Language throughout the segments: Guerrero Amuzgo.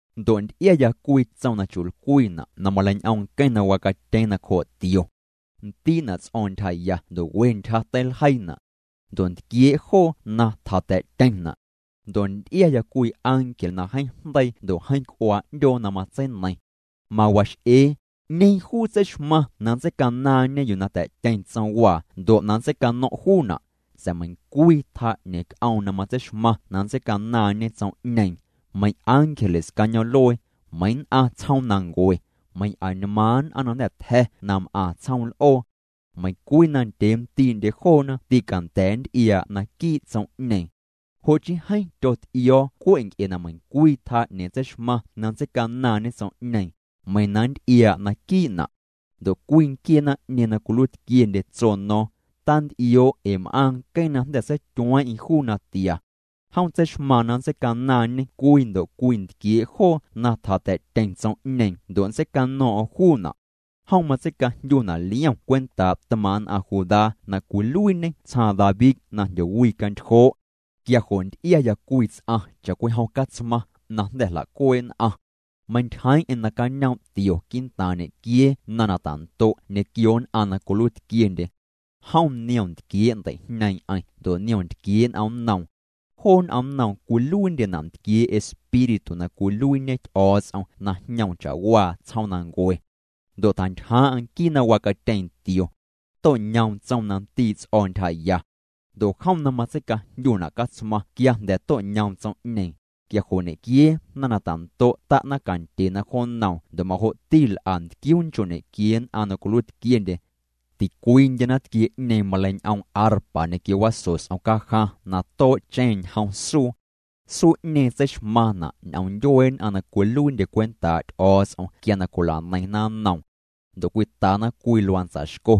Ndo' nty'iaya cwii tsom na chu'lcwiina' na maleiñ'oom nqueⁿ na wacatyeeⁿ nacjoo' tio. Ndii'na' ts'o̱o̱ⁿ ntyjaya ndo' we ntyja teiljeiina'. Ndo' ntquiee' joo na tjata̱'tyeⁿna'. Ndo' nty'iaya cwii ángel na jeeⁿ jndeii ndo' jeeⁿ c'uaa 'ndyoo na matseineiⁿ. Mawax'ee: —¿'Ñeeⁿ juu tseixmaⁿ na nntseicanaaⁿñe yuu na ta̱'tyeⁿ tsomwaa ndo' na nntseicano̱ⁿ' juuna'? Sa̱a̱ meiⁿcwii tjaa 'ñeeⁿ c'oom na matseixmaⁿ na nntseicanaaⁿñe tsom'ñeeⁿ, meiⁿ ángeles cañoom'luee, meiⁿ nn'aⁿ tsjoomnancue, meiⁿ añmaaⁿ nn'aⁿ na jnda̱ tja̱ na m'aⁿ tsjoom l'oo. Meiⁿ cwii na ndyee ndii'ndye joona tîcanda̱a̱ nty'iaa' naquii' tsom'ñeeⁿ. Jo' chii jeeⁿ tyot'io̱o̱ cwe' nc'e na meiⁿcwii tjaa 'ñeeⁿ tseixmaⁿ na nntseicanaaⁿñe tsom'ñeeⁿ, meiⁿ na nnty'iaa' naquii'na'. Ndo' cwii nquiee naⁿ'ñeeⁿ na cwiluiitquiendye tso no̱o̱ⁿ: —Tant'ioo' ee m'aaⁿ nqueⁿ na jnda̱ seityueeⁿ'eⁿ juu natia. Jom tseixmaaⁿ na nntseicanaaⁿñê cwii ndo' cwii ntquiee' joo na tjata̱'tyeⁿ tsom'ñeeⁿ ndo' nntseicano̱o̱ⁿ'o̱ⁿ juuna'. Jom matseicajndyuna' Liom cwentaa' tmaaⁿ' nn'aⁿ Judá na cwiluiiñê tsjaaⁿ David na jndyowicantyjoo'. Quia jo' nty'iaya cwii ts'aⁿ cha'cwijom catsmaⁿ na jnda̱ jla'cuee' nn'aⁿ. Meintyjeeⁿ'eⁿ nacañoom' tio quii'ntaaⁿ ñequiee naⁿta'ndo' ñequio nn'aⁿ na cwiluiitquiendye. Jom niom ntquiee' ndei'jñeeⁿ'eⁿ ndo' niom ntquiee' n'omnnoom. Joo n'omnnoom cwiluiindyena' ntquiee' Espíritu na cwiluiiñe Ty'o̱o̱ts'om na jñoom cha'waa tsjoomnancue. Ndo' tjantyjaaⁿ'aⁿ nquii na wacatyeeⁿ tio. To'ñoom tsom na ndii' ts'o̱ ntyjaya. Ndo' jom na matseicajndyuna' Catsmaⁿ quia jnda̱ to'ñoom tsom'ñeeⁿ, quia jo' ñequiee naⁿ na ta'ndo' ta'na cantyena jo nnoom ndo' majo'ti l'a ntquiuu nchoo' ñequiee nn'aⁿ na cwiluiitquiendye. Ticwiindye naⁿtquie'ñeeⁿ maleiñ'oom arpa ñequio waso s'om cajaⁿ na too'cheⁿna' ñjom suu. Suu'ñeeⁿ tseixmaⁿna' ñ'oom ndyuee nn'aⁿ na cwiluiindye cwentaa' Ty'o̱o̱ts'om quia na cwila'neiⁿna nnoom. Ndo' cwitana cwii luantsa xco.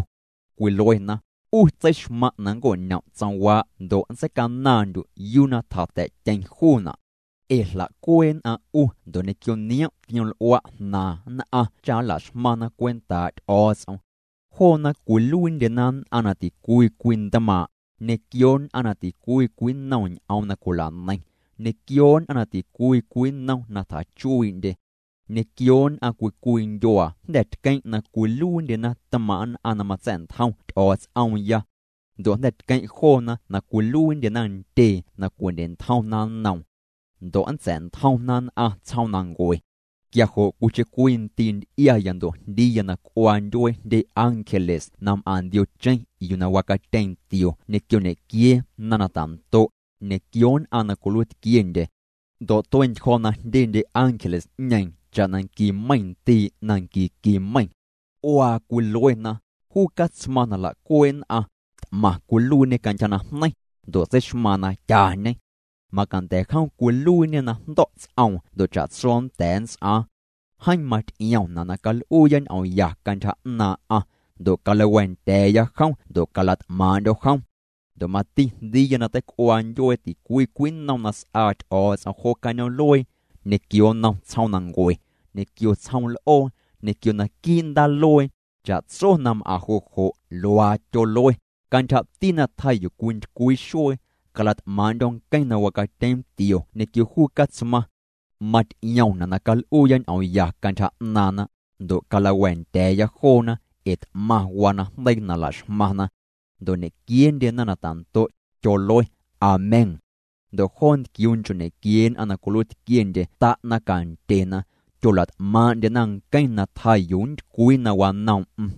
Cwiluena: 'U tseixmaⁿ' na nnco'ñom' tsomwaa' ndo' nntseicanaaⁿndyu' yuu na tjata̱'tyeⁿ juuna'. Ee jla'cuee' nn'aⁿ 'u ndo' ñequio niom' tioml'ua' jnaaⁿ nn'aⁿ cha nla'xmaⁿna cwentaa' Ty'o̱o̱ts'om. Joona cwiluiindyena nn'aⁿ na ticwii cwii ntmaaⁿ', ñequio nn'aⁿ na ticwii cwii nnom ñ'oom na cwila'neiⁿ, ñequio nn'aⁿ na ticwii cwii nnom na tjachuii'ndye, ñequio nn'aⁿ cwii cwii ndyuaa. Jnda̱ tqueⁿ' na cwiluiindyena tmaaⁿ' nn'aⁿ na matsa̱'ntjom Ty'o̱o̱ts'oomya. Ndo' jnda̱ tqueⁿ' joona na cwiluiindyena ntyee na cwindye'ntjomna nnoom. Ndo' nntsa̱'ntjomna nn'aⁿ tsjoomnancue. Quia jo' cwiicheⁿ cwii ndii' nty'iaya ndo' jndiiya na c'uaa ndyuee jndye ángeles na m'aⁿ ndiocheⁿ yuu na wacatyeeⁿ tio ñequio ñequiee naⁿ na ta'ndo', ñequio nn'aⁿ na cwiluiitquiendye. Ndo' tue'ntyjo̱ na jndyendye ángeles'ñeeⁿ cha'na nqui meiⁿ ndii' na nqui nqui meiⁿ. C'uaa cwiluena: Juu Catsmaⁿ na jla'cuee' nn'aⁿ, t'maⁿ cwiluiiñê cantyja najneiⁿ, ndo' tseixmaaⁿ na tyañê. Macanda̱ jom cwiluiiñê na jndo̱' ts'oom ndo' cha'tso nnda̱a̱ nnts'aaⁿ. Jeeⁿ maty'iomna' na cal'uuya ñ'oom ya cantyja 'naaⁿ'aⁿ, ndo' calawa̱a̱ndya̱a̱ya jom ndo' cala't'maaⁿ'ndyo̱ jom. Ndo' mati jndiiya na teic'uaa ndyuee ticwii cwii nnom na s'aa Ty'o̱o̱ts'om jo cañoom'luee, ñequio nnom tsjoomnancue, ñequio tsjoom l'oo, ñequio naquii' ndaaluee. Cha'tso na m'aⁿ jo' jo' luaa tyolue: Cantyjati na tjaa yuu cwintycwii xuee, cala't'maaⁿ'ndyo̱ nqueⁿ na wacatyeeⁿ tio ñequio juu Catsmaⁿ. Maty'iomyana' na cal'uuya ñ'oom ya cantyja 'naaⁿna, ndo' calawa̱a̱ndya̱a̱ya joona, ee t'maⁿ waa najndeii na la'xmaⁿna. Ndo' ñequieendye naⁿ na ta'ndo', tyolue: —Amén. Ndo' joo ntquiuu nchoo' ñequiee nn'aⁿ na cwiluiitquiendye ta'na cantyena, tyola't'maaⁿ'ndyena nqueⁿ na tjaa yuu nntycwii na wanoom'm.